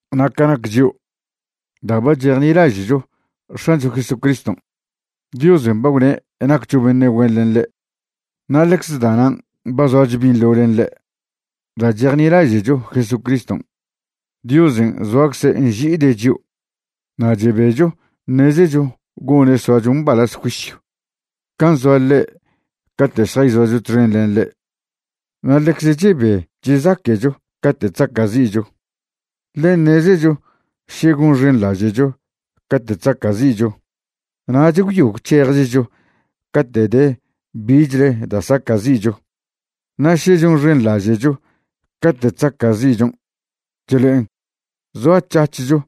Na' ca nac chio', da' ba chejnilaže'cho X̱ancho Jesucriston', Diosen' ba gwne' naccho beṉe' güen len ḻe', na' ḻecze da'nan' ba zoacho binḻo len ḻe'. Da' chejnilaže'cho Jesucriston', Diosen' zoacze' nži'ide' chio'. Na' chebecho ṉezecho gone' soacho mbalaz juisyw can' zoa ḻe' cate' šjayzoacho txen len ḻe'. Na' ḻecze chebe chezaque'cho cate' chzaca'zi'cho, ḻe ṉezecho še gonxenḻaže'cho cate' chzaca'zi'cho, nach gwyo gwc̱hejechcho cate' de bichle da' saca'zi'cho. Na' še chonxenḻaže'cho cate' chzaca'zi'chon', chlo'en zoac̱hac̱hcho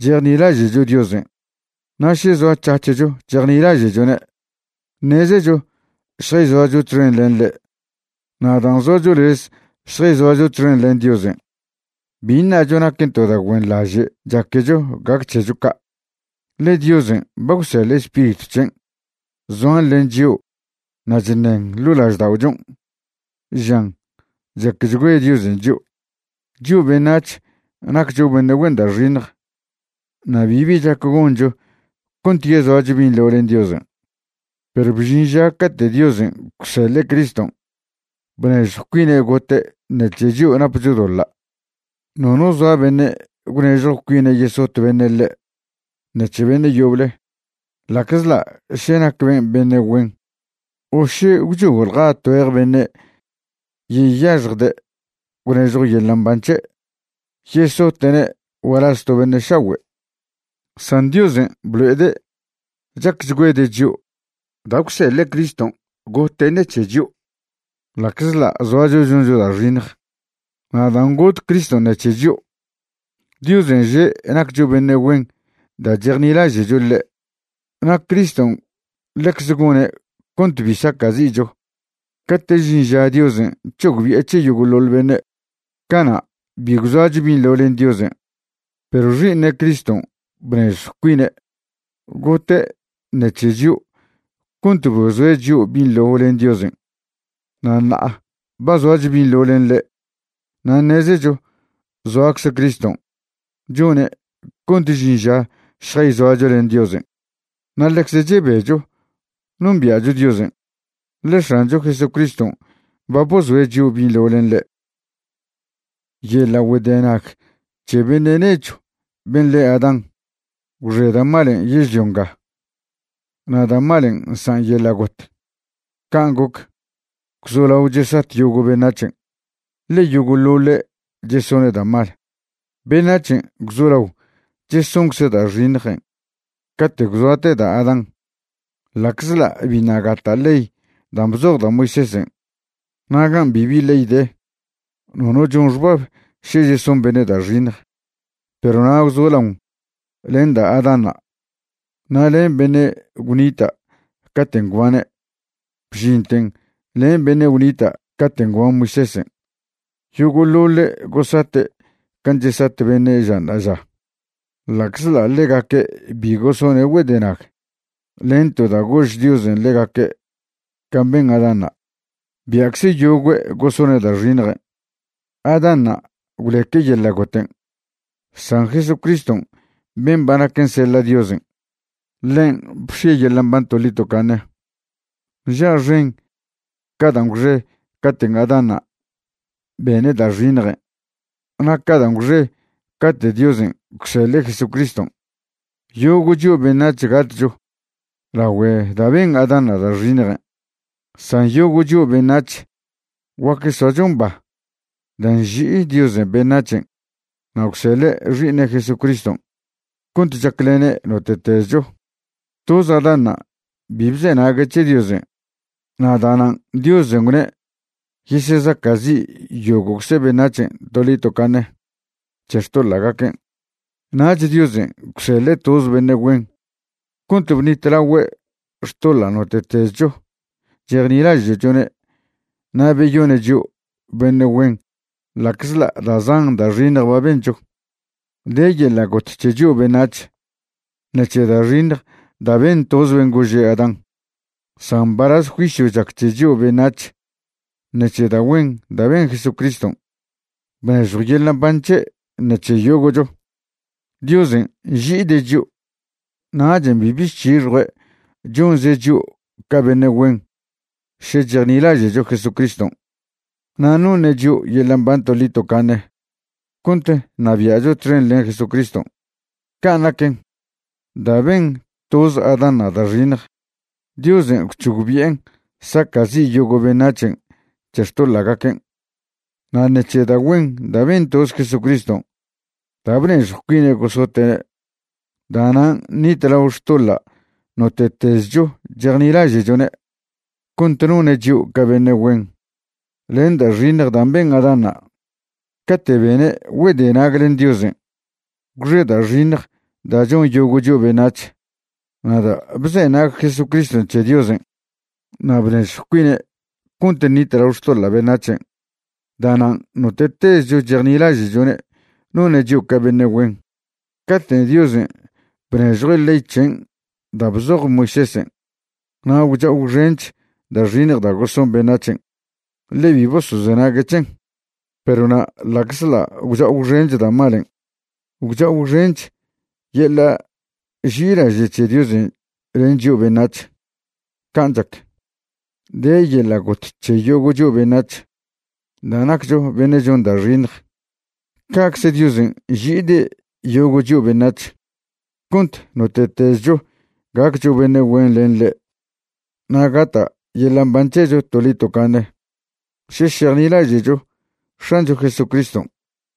chejnilaže'cho Diosen'. Na' še zoac̱hac̱hcho chejnilaže'chone', ṉezecho šjayzoacho txen len ḻe'. Na' dan' zoacho lez šjayzoacho txen len Diosen', bi ṉacho naquen to da' güenḻaže' chaquecho gac c̱hecho ca'. Ḻe Diosen' ba gwseḻe' Spiritw c̱hen' zoan len chio' na' chṉen ḻo' lažda'ochon' žan chacchgüe Diosen' chio'. Chio' beṉac̱h naccho beṉe' güen da' xiṉj na' bibi chac goncho cont yezoacho binḻo len Diosen', perw bžin ža cate' Diosen' gwseḻe' Criston' bnežjw cuine' gote' ṉec̱he chio' napcho doḻa'. Nono zoa beṉe' gwnežjw cuine' yesot beṉe' ḻe' ṉec̱he beṉe' yoble, ḻa'czḻa' še nac ben' beṉe' güen, o še gwchojḻja tgüej beṉe' yeyaxjde' gwnežjw yeḻa' mban c̱he' yesote'ne' gualaz to beṉe' šagüe'. San Diosen' blo'ede' chacchgüede' chio' da' gwseḻe' Criston' gote' ṉec̱he chio' ḻa'czḻa' zoacho choncho da' xiṉj. Na' dan' got Criston' ṉec̱he chio', Diosen' že' naccho beṉe' güen da' chejnilaže'cho ḻe'. Na' Criston' ḻecze gone' cont bi saca'zi'cho cate' žin žan' Diosen' c̱hogbi'e c̱he yogo'ḻoḻ beṉe'. Cana' bi gwzoacho binḻo len Diosen'. Perw Xi'iṉe' Criston' bnežjw cuine' gote' ṉec̱he chio' cont bozoe' chio' binḻo len Diosen'. Na' ṉa'a ba zoacho binḻo len ḻe' na' ṉezecho zoacze Criston' chone' cont žin ža šjayzoacho len Diosen'. Na' ḻecze chebecho nombia'cho Diosen', ḻe X̱ancho Jesucriston' ba bozoe' chio' binḻo len ḻe'. Yeḻa' güedenag c̱he beṉe' nechw ben' le Adán gwxe da' malen' yežlio nga, na' da' malen' nsan' yeḻa' got. Can' goc, gwzolao chesat yogo' beṉac̱hen', ḻe yogo'ḻoḻe' chesone' da' mal. Beṉac̱hen' gwzolao chesoncze' da' xiṉjen' cate' gwzoate da' Adán, ḻa'czḻa' biṉa' gata' ley dan' bzoj da' Moisésen'. Na' gan' bibi ley de, nono chon xbab še cheson beṉe' da' xiṉj. Perw na' gwzolaon len da' Adánṉa' na' len beṉe' gwnita' caten' gwbane', bžinten len beṉe' gwnita' caten' gwban Moisésen', yogo'ḻoḻe' gosate' can' chesat beṉe' ža ṉa'aža. Ḻa'czḻa' ḻegaque' bi gosone' güedenag len to da' gož Diosen' ḻegaque' can' ben Adánṉa', bia'cze yogüe' gosone' da' xiṉjen'. Adánṉa' gwleque' yeḻa' goten', san Jesucriston' ben' ba naquen seḻa' Diosen', ḻen' bx̱ie' yeḻa' mban toḻi tocaṉe. ¡Nža' xen ca dan' gwxe caten' Adánṉa' bene' da' xiṉjen' na' ca dan' gwxe cate' Diosen' gwseḻe' Jesucriston'! Yogo' chio' beṉac̱h gatcho lagüe da' ben Adánṉa' da' xiṉjen', san yogo' chio' beṉac̱h guac soacho mba da' nži'i Diosen' beṉac̱hen' na' gwseḻe' Xi'iṉe' Jesucriston' cont chaclene' note'tezcho. Toz Adánṉa' bi bzenague' c̱he Diosen' na' da'nan' Diosen' gwne' yesezaca'zi' yogo'cze beṉac̱hen' toḻi tocaṉe c̱he xtoḻa'gaquen'. Nach Diosen' gwseḻe' toz beṉe' güen cont bṉitlagüe' xtoḻa' note'tezcho chejnilaže'chone' na' beyone' chio' beṉe' güen ḻa'czḻa' da' zan da' xiṉj ba bencho. De yeḻa' got c̱he chio' beṉac̱h ṉec̱he da' xiṉj da' ben toz ben' gože' Adán, san mbalaz juisyw chac c̱he chio' beṉac̱h ṉec̱he da' güen da' ben Jesucriston' bnežjw yeḻa' mban c̱he' ṉec̱he yogo'cho. Diosen' nži'ide' chio', nachen' bibi chc̱hixjue' chonze' chio' ca beṉe' güen še chejnilaže'cho Jesucriston', na' noṉe' chio' yeḻa' mban toḻi tocaṉe cont ṉabia'cho txen len Jesucriston'. Can' naquen, da' ben toz Adánṉa' da' xiṉj, Diosen' gwc̱hogbi'en saca'zi' yogo' beṉac̱hen' c̱he xtoḻa'gaquen'. Na' ṉec̱he da' güen da' ben toz Jesucriston' da' bnežjw cuine' gosote'ne', da'nan' ṉitlao xtoḻa' note'tezcho chejnilaže'chone', cont none' chio' ca beṉe' güen. Len da' xiṉj dan' ben Adánṉa' cate' bene' güedenag len Diosen', gwxe da' xiṉj da' chon yogo' chio' beṉac̱h. Na' da' bzenag Jesuscriston' c̱he Diosen' na' bnežjw cuine' cont ṉitlao xtoḻa' beṉac̱hen', da'nan' note'tezcho chejnilaže'chone' none' chio' ca beṉe' güen. Cate' Diosen' bnežjue' ley c̱hen' da' bzoj Moisésen' na' gwcha'o gwxench da' xiṉj da' goson beṉac̱hen', ḻe bi bosozenague' c̱hen. Perw na' ḻa'czḻa' gwcha'o gwxen da' malen', gwcha'o gwxench yeḻa' ži'ilaže' c̱he Diosen' len chio' beṉac̱h. Can' chac, de yeḻa' got c̱he yogo' chio' beṉac̱h da' naccho beṉe' chon da' xiṉj, ca'cze Diosen' nži'ide' yogo' chio' beṉac̱h cont note'tezcho gaccho beṉe' güen len ḻe' na' gata' yeḻa' mban c̱hecho toḻi tocaṉe še šejnilaže'cho X̱ancho Jesucriston'.